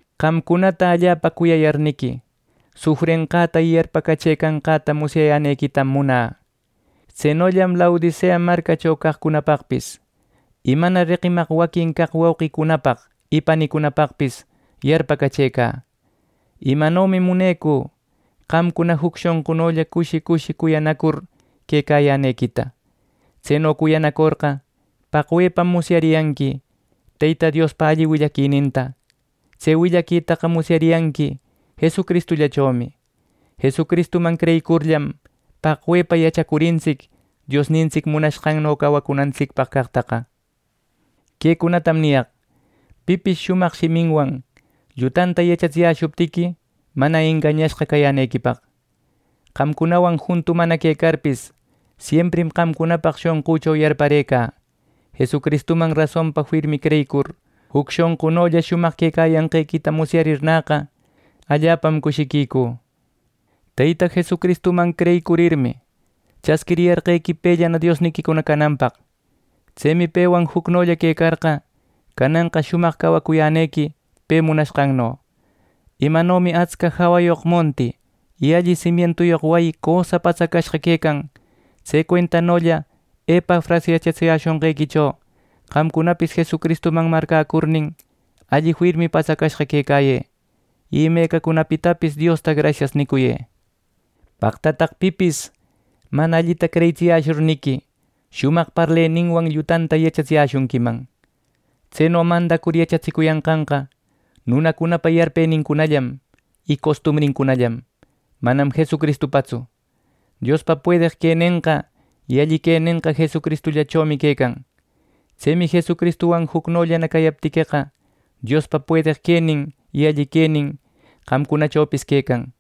Qamcunata allapa cuyayarniqui, sufrenqäta y yarpacachëcanqäta musyayänequitam munä. Tsenollam Laodicea marcacho caqcunapaqpis, y mana reqimaq waquin caq wauqicunapaq y panicunapaqpis yarpacachëcä. Imanomi munecü qamcuna juc shonqunolla cushi cushi cuyanacur quecayänequita. Tseno cuyanacorqa, paqwepam musyariyanqui Teyta Diospa alli willaquininta. Tse willaquitaqa musyariyanqui Jesucristullachomi. Jesucristuman creyicurllam, paqwepa yachacurintsic Diosnintsic munashqanno cawacunantsicpaq caqtaqa. Quecunatam niyaq, pipis shumaq shiminwan llutanta yachatsiyäshuptiqui, mana engañashqa cayänequipaq. Qamcunawan juntu mana quecarpis, siemprim qamcunapaq shonqücho yarparëcä. Jesucristuman rasonpa firmi creyicur, juc shonqunolla shumaq quecayanqequita musyarirnäqa, allapam cushiquicü. Teyta Jesucristuman creyicurmi, chasquiriyarqequi pellana Diosniquicuna cananpaq. Tsemi pewan jucnolla quecarqa, cananqa shumaq cawacuyänequi pe munanqanno. Imanomi atsca jawayoq monti y alli simientuyoq wayi cösa patsacashqa quecan; tse cuentanolla Epafras yachatsiyäshonqequicho qamcunapis Jesucristuman marcäcurnin, alli firmi patsacashqa quecayë, y imecacunapitapis Diosta “Grasias” nicuyë. ¡Paqtataq, pipis mana allita creyitsiyäshurniqui, shumaq parleninwan llutanta yachatsiyäshunquiman! Tseno mandacur yachatsicuyanqanqa nunacunapa yarpenincunallam y costumbrincunallam, manam Jesucristupatsu. Diospa puedeq quenenqa y alli quenenqa Jesucristuchomi quecan. Tsemi Jesucristuwan jucnollana cayaptiqueqa, Diospa puedeq quenin y alli quenin qamcunachopis quecan.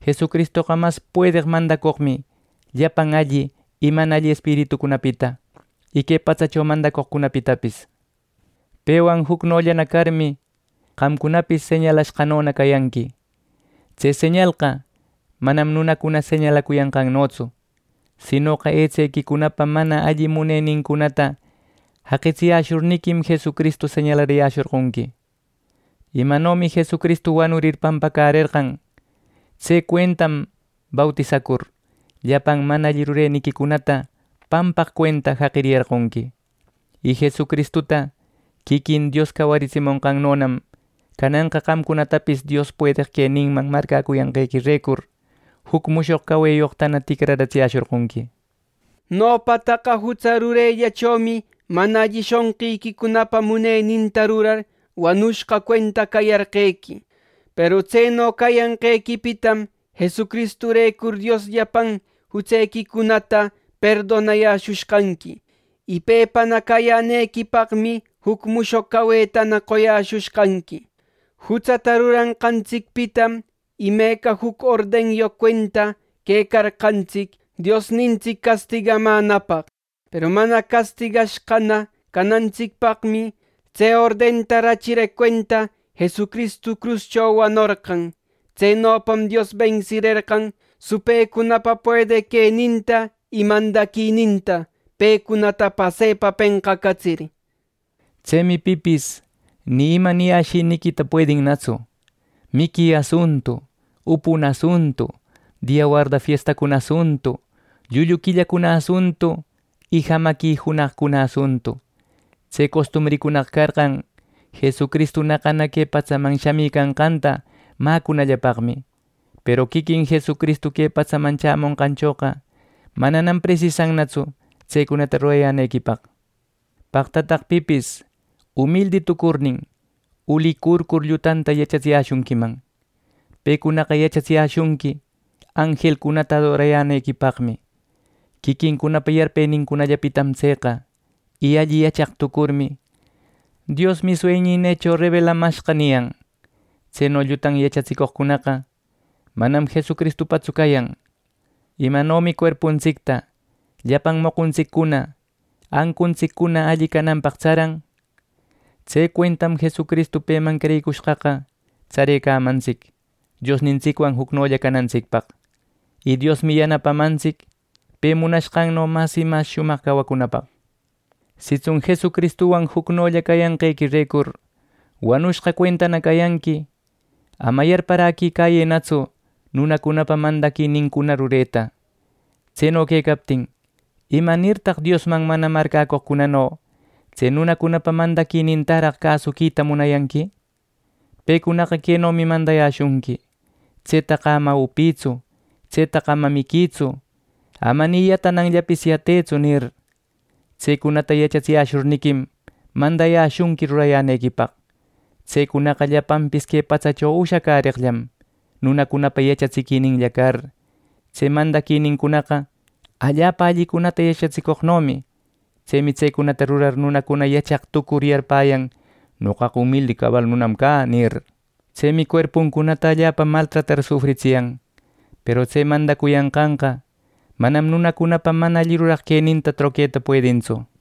Jesucristoqa mas puedeq mandacoqmi llapan alli y mana alli espiritucunapita, y que patsacho mandacoqcunapitapis. Pewan jucnollana carmi, qamcunapis señalashqanona cayanqui. Tse señalqa manam nunacuna señalacuyanqannotsu; sinoqa etsequicunapa mana alli muneniquicunata jaqitsiyäshurniquim, Jesucristu señalariyäshorqonqui. Imanomi Jesucristu wanurir pampacärerqan, tse cuentam bautisacur, llapan mana alli rureniquicunata pampaq cuenta jaqiriyarqonqui. Y Jesucristuta quiquin Dios cawaritsimushqannonam, cananqa qamcunatapis Diospa puedeq queninman marcäcuyanqequirecur, juc mushoq caweyoqtana ticraratsiyäshorqonqui. Nopataqa jutsa rurellachomi mana alli shonqiquicunapa muneninta rurar, wanushqa cuenta cayarqequi. Peru tseno cayanqequipitam Jesucristurecur Dios llapan jutsequicunata perdonayäshushqanqui, y pepana cayänequipaqmi juc mushoq cawetana qoyäshushqanqui. Jutsata ruranqantsicpitam imeca juc ordenyoq cuenta quecarqantsic Diosnintsic castigamänapaq. Peru mana castigashqana canantsicpaqmi, tse ordenta rachireq cuenta Jesucristu cruscho wanorqan. Tsenopam Dios bensirerqan supëcunapa puedeq queninta y mandaquininta, pecunata pasepa penqacatsir. Tsemi pipis ni ima niyäshiniquita puedinnatsu, miqui asuntu, upuna asuntu, dia warda fiestacuna asuntu, llullu quillacuna asuntu, y jamaqui junaqcuna asuntu. Tse costumbricunaqa carqan Jesucristu naqana que patsaman shamïcanqanta mäcunallapaqmi. Peru quiquin Jesucristu que patsaman chämonqanchoqa mananam presisannatsu tsecunata rurayänequipaq. Paqtataq pipis umildi tucurnin, ulicurcur llutanta yachatsiyäshunquiman. Pecunaqa yachatsiyäshunqui anjelcunata adorayänequipaqmi. Quiquincunapa yarpenincunallapitam tseqa. Y alli yachaq tucurmi, “Diosmi sueñïnïcho rebelamashqa” niyan. Tseno llutan yachatsicoqcunaqa manam Jesucristupatsu cayan. Imanomi cuerpuntsicta llapan moquntsiccuna, ancuntsiccuna alli cananpaq tsaran; tse cuentam Jesucristu, peman creyicushqaqa, tsarecamantsic Diosnintsicwan jucnolla canantsicpaq. Y Diosmi yanapamantsic pe munanqanno mas y mas shumaq cawacunapaq. Sitsun Jesucristuwan jucnolla cayanqequirecur wanushqa cuentana cayanqui, ama yarpäraquicayënatsu nunacunapa mandaquinincuna rureta. Tseno quecaptin ¿imanirtaq Diosman mana marcäcoqno tse nunacunapa mandaquinintaraq cäsuquita munayanqui! Pecunaqa quenomi mandayäshunqui: “¡Tsetaqa ama upïtsu! ¡Tsetaqa ama miquïtsu! ¡Ama ni yatananllapis yatequïtsu!” nir. Tsecunata yachatsiyäshurniquim, mandayäshunqui rurayänequipaq. Tsecunaqa llapanpis que patsacho ushacäreqllam, nunacunapa yachatsiquininlla car. Tse mandaquinincunaqa allapa allicunata yachatsicoqnomi. Tsemi tsecunata rurar, nunacuna yachaq tucur, yarpäyan “Noqaqa umildi cabal nunam cä” nir. Tsemi cuerpuncunata allapa maltratar sufritsiyan. Peru tse mandacuyanqaqa manam nunacunapa mana alli ruraq queninta troqueta puedintsu.